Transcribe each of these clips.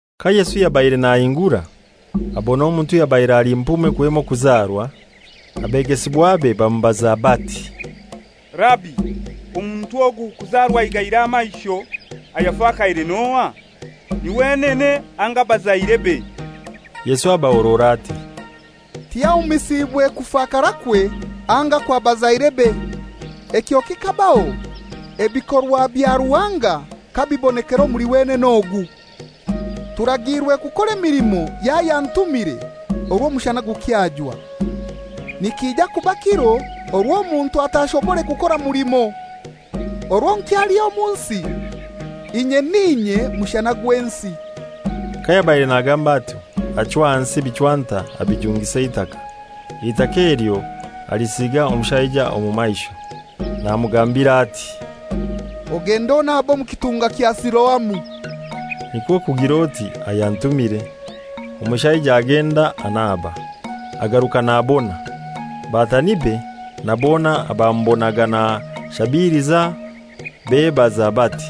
Ka Yesu yabaire nahingura, abona omuntu ayabaire ali mpume kwema okuzarwa. Abegesibwabe bamubaza ati, «Rabi, omuntu ogu kuzarwa aigaire amaisho, ayafakaire n'ohai? Ni wenene anga abazairebe?» Yesu abahorora ati, «Tiyahumisiibwe kufakarakwe anga kwa bazairebe. Ekyo kikabaho ebikorwa bya Ruhanga kabibonekera omuli wenene ogu. Turagiirwe kukora emilimo y'ayantumire, orwo omushana gukyajwa. Nikija kuba kiro orwo omuntu atashobore kukora mulimo. Orwo nkyali omu nsi, inye n'inye mushana gw'ensi.» Kayabaire nagamba atyo, achwa ahansi ebichwanta abijungisa eitaka, eitaka elyo alisiga omushaija omu maisho, namugambira ati, «Ogende onabe omu kitunga kya Siloamu» (nikwo kugir'oti, «Ayantumire.») Omushaija agenda anaba, agaruka nabona. Batanibe na bona abamubonaga nashabiliza bebaza bati,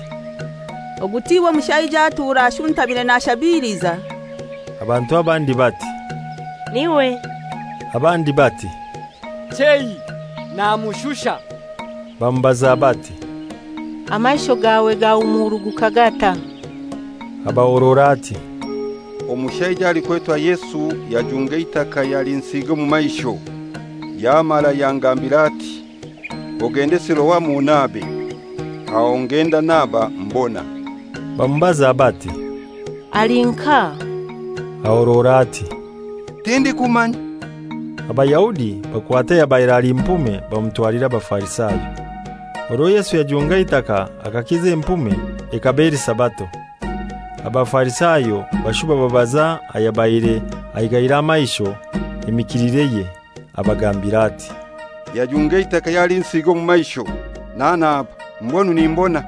«Ogu tiwe mushaija atura ashuntamire nashabiliza?» Abantu abandi bati, «N'iwe,» abandi bati, «Chei, namushusha.» Bamubaza bati, «Amaisho gawe gahumuruguka gatai?» Abahorora ati, «Omushaija alikwetwa Yesu yajunga eitaka yalinsiiga omu maisho, yamara yangambira ati, ‹Ogende Siloamu onabe;› aho ngenda naba, mbona.» Bamubaza bati, «Ali nkahai?» Ahorora ati, «Tindikumanya.» Abayahudi bakwata ayabaire ali mpume bamutwalira Abafarisayo. Orwo Yesu yajunga eitaka akakiza empume ekaba eli Sabato. Abafarisayo bashuba babaza ayabaire aigaire amaisho emikilireye. Abagambira ati, «Yajunga eitaka yalinsiiga omu maisho, nanaba, mbwenu nimbona.»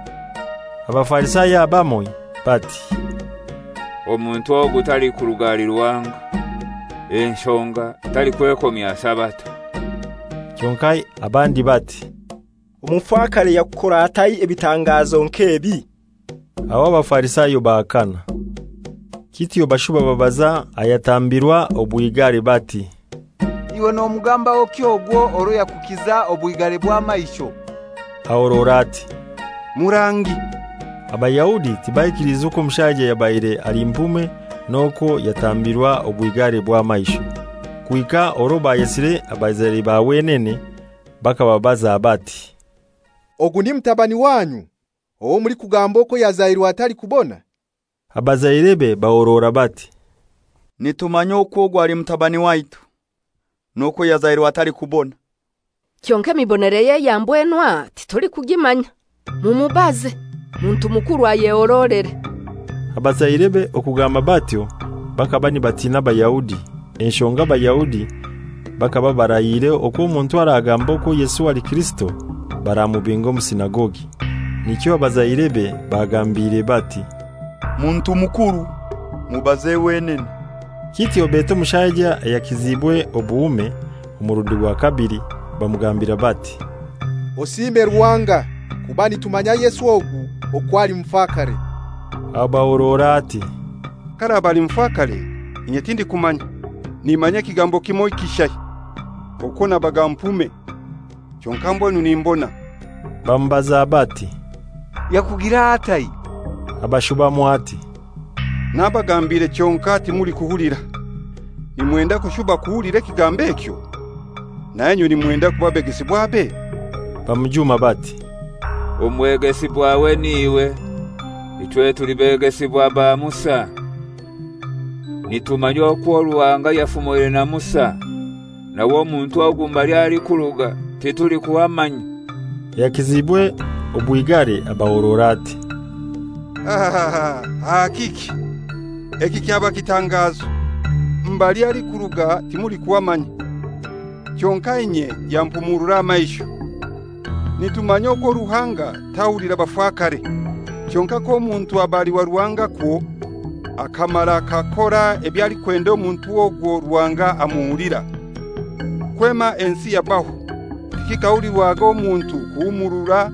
Abafarisayo abamoiho bati, «Omuntu ogu talikuruga ahali Ruhanga, enshonga talikwekomya Sabato.» Kyonkai abandi bati, «Omufakare yakukora atai ebitangazo nk'ebi?» Aho Abafarisayo bahakana. Kityo bashuba babaza ayatambirwa obwigare bati, «Iwe nomugambahoki ogwo orwo yakukiza obwigare bw'amaisho?» Ahorora ati, «Murangi.» Abayahudi tibaikiliize okwo omushaija yabaire ali mpume n'okwo yatambirwa obwigare bw'amaisho, kuhika orwo bayesire abazaire ba wenene, bakababaza bati, «Ogu ni mutabani wanyu, owo mulikugamba okwo yazairwe atalikubona?» Abazairebe bahorora bati, «Nitumanya okwo ogu ali mutabani waitu, n'okwo yazairwe atalikubona. Kyonkai emibonereye eya mbwenu aha titulikugimanya. Mumubaze; muntu mukuru, ayehorolere.» Abazairebe okugamba batyo bakaba nibatina Abayahudi, enshonga Abayahudi bakaba barahiire okwo omuntu aragamba okwo Yesu ali Kirisito baramubinga omu sinagogi. Nikyo abazairebe bagambiire bati, «Muntu mukuru, mubaze wenene.» Kityo beta omushaija ayakiziibwe obuhume omurundi gwa kabili, bamugambira bati, «Osiime Ruhanga, kuba nitumanya Yesu ogu okwo ali mufakare.» Abahorora ati, «K'araba ali mufakare, inye tindikumanya. Nimanya ekigambo kimoi kishai, okwo nabaga mpume, kyonkai mbwenu nimbona.» Bamubaza bati, «Yakugira atai?» Abashubamu ati, «Nabagambiire kyonkai timulikuhulira. Nimwenda kushuba kuhulira ekigambo ekyo? Nainywe nimwenda kuba begesibwabe?» Bamujuma bati, «Omwegesibwawe n'iwe; ichwe tuli begesibwa ba Musa. Nitumanya okwo Ruhanga yafumoire na Musa; nawe omuntu ogu mbali alikuruga titulikuhamanya.» Ayakiziibwe obwigare abahorora ati, «Aha kiki? Eki kyaba kitangazo! Mbali alikuruga timulikuhamanya, kyonkai inye yampumurura amaisho. Nitumanya okwo Ruhanga tahulira bafakare. Kyonkai k'omuntu aba ali wa Ruhanga kwo akamara akakora eby'alikwenda, omuntu ogwo Ruhanga amuhulira. Kwema ensi yabaho tikikahulirwaga omuntu kuhumuurura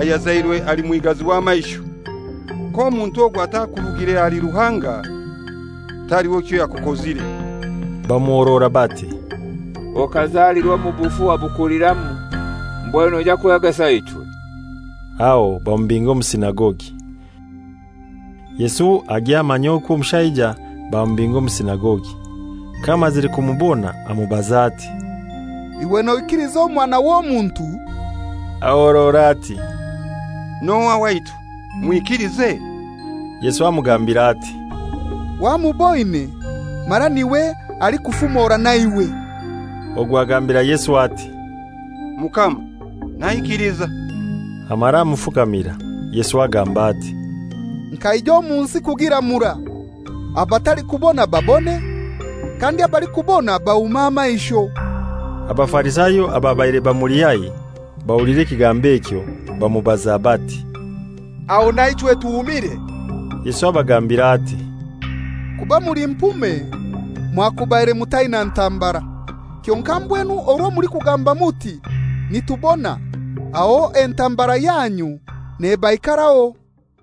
ayazairwe ali mwigazi w'amaisho. K'omuntu ogu atakurugire ahali Ruhanga, taliho kyoyakukozire.» Bamuhorora bati, «Okazalirwa omu bufu wabukuliramu, mbwenu noija kwegesa ichwe?» Aho bamubinga omu sinagogi. Yesu agya amanya okwo omushaija bamubinga omu sinagogi. Kayamazire kumubona amubaza ati, «Iwe noikiliza Omwana w'Omuntu?» Ahorora ati, «N'ohai waitu, mwikilize?» Yesu amugambira ati, «Wamuboine, mara n'iwe alikufumora naiwe.» Ogwo agambira Yesu ati, «Mukama, naikiliza,» amara amufukamira. Yesu agamba ati, «Nkaija omu nsi kugiramura, abatalikubona babone, kandi abalikubona bahume amaisho.» Abafarisayo ababaire bamuli haihi bahulira ekigambo ekyo, bamubaza bati, «Aho naichwe tuhumire?» Yesu abagambira ati, «Kuba muli mpume mwakubaire mutaina ntambara; kyonkai mbwenu orwo mulikugamba muti, ‹Nitubona,› aho entambara yanyu nebaikaraho.»